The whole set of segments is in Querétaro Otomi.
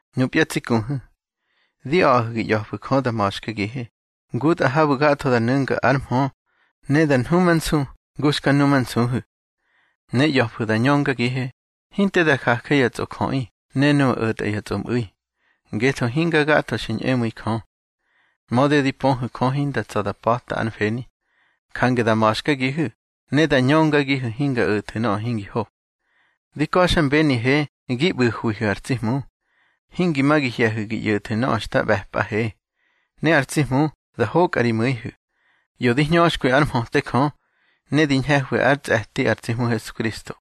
Nupya tsi kuhu̱, di a̱ꞌahu̱ gi ꞌya̱fu̱ Jö da ma̱xkagihe, ngutꞌa habu̱ gatho da nu̱nga ár mhö, ne da nhumansu ngu xka numansuhu̱. Ne ꞌya̱fu̱ da ñöngagihe, hinte da jaje ya tsꞌojöꞌi ne nuꞌu̱ o̱tꞌa ya tsꞌomꞌu̱i, ngetho hinga gatho xi ñꞌemu̱i Jö. Mödi di pöhu̱ Jö hinda tsa̱ da pa̱ta ár mfeni, jange da ma̱xkagihu̱ ne da ñöngagihu̱ hinga o̱thu̱ nöꞌö hingi ho. Di ka̱xmbenihe gi ꞌbu̱hwihu̱ ar tsi Hmu, hingi ma gi hye̱hu̱ gi ꞌyo̱thu̱ nöꞌö xta ꞌbe̱pꞌahe. Ne ar tsi Hmu da hokꞌa ri mu̱ihu̱, ꞌyo di hñöxkwi ár mhöte Jö, ne di ñhe̱hwi ár tsꞌe̱ti ar tsi Hmu Hesukristo.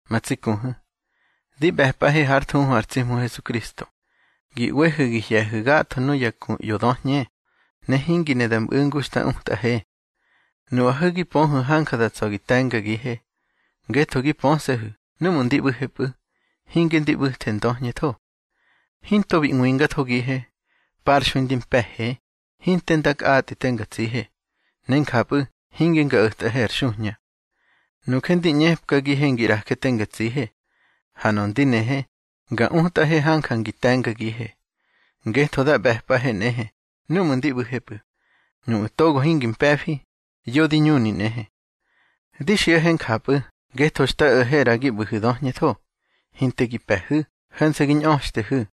Ma tsi kuhu̱, di ꞌbe̱pꞌahe hár thuhu ar tsi Hmu Hesukristo, gi ꞌwehu̱ gi hye̱hu̱ gatho nuya ku ꞌyo döhñe, ne hingi ne da ꞌmu̱ ngu xta utꞌahe. Nuꞌahu̱ gi pöhu̱ hanja da tsa̱ gi te̱ngagihe, ngetho gi pöse̱hu̱ núꞌmu̱ ndi ꞌbu̱hepꞌu̱, hinge ndi ꞌbu̱the ndöhñetho. Hinto bi ꞌwingathogihe. Parxui ndi mpe̱he, hinte nda kꞌatꞌi te nga tsihe, ne njapꞌu̱ hinge nga o̱tꞌahe ar xuhña. Nuje ndi ꞌñepkagihe ngi ꞌraje te nga tsihe, ha nöꞌö ndi nehe, nga utꞌahe hanja ngi te̱ngagihe. Ngetho da ꞌbe̱pꞌahe nꞌehe núꞌmu̱ ndi ꞌbu̱hepꞌu̱, nuꞌu̱ togo hingi mpe̱fi, yo di ñuni nꞌehe. Di xiꞌahe njapꞌu̱ ngetho xta o̱he ꞌra gi ꞌbu̱hu̱ ndöhñetho, hinte gi pe̱hu̱, ho̱nse̱ gi ñꞌöxtehu̱.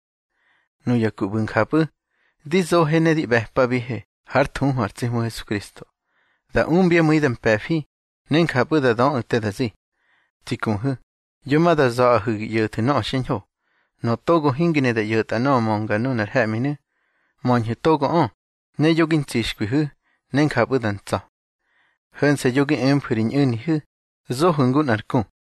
Nuya ku ꞌbu̱ njapꞌu̱, di zohe ne di ꞌbe̱pabihe hár thuhu ar tsi Hmu Hesukristo, da umbyá mu̱i da mpe̱fi, ne njapꞌu̱ da döꞌu̱ te da zi. Tsi kuhu̱, yo ma da za̱ꞌahu̱ gi ꞌyo̱thu̱ nöꞌö xiñho. Nöꞌö togo hingi ne da ꞌyo̱ta nöꞌö mönga nunar he̱ꞌminu̱, möñhu̱ togoꞌö, ne yo gi ntsixkwihu̱, ne njapꞌu̱ da ntsa̱. Ho̱nse̱ yo gi emfu̱ ri ñꞌu̱nihu̱, zohu̱ ngu nꞌar ku.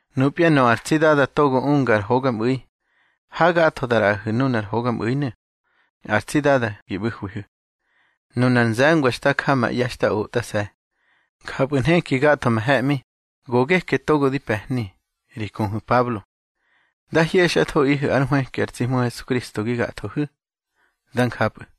Nupya nöꞌö ar tsi Dada togo unga ar hogaꞌmu̱i, hagatho da ꞌraꞌahu̱ nunar hogaꞌmu̱inu̱. Ar tsi Dada gi ꞌbu̱hwihu̱. Nunar nze̱ngwa xta ja ma ꞌye̱ xta otꞌase̱. Njapꞌu̱ nheki gatho ma he̱ꞌmi, go geke togo di pe̱hni, ri kuhu̱ Pablo. Dá hyexꞌathoꞌihu̱ ár nhwëki ar tsi Hmu Hesukristo gi gathoꞌihu̱. Dá njapꞌu̱.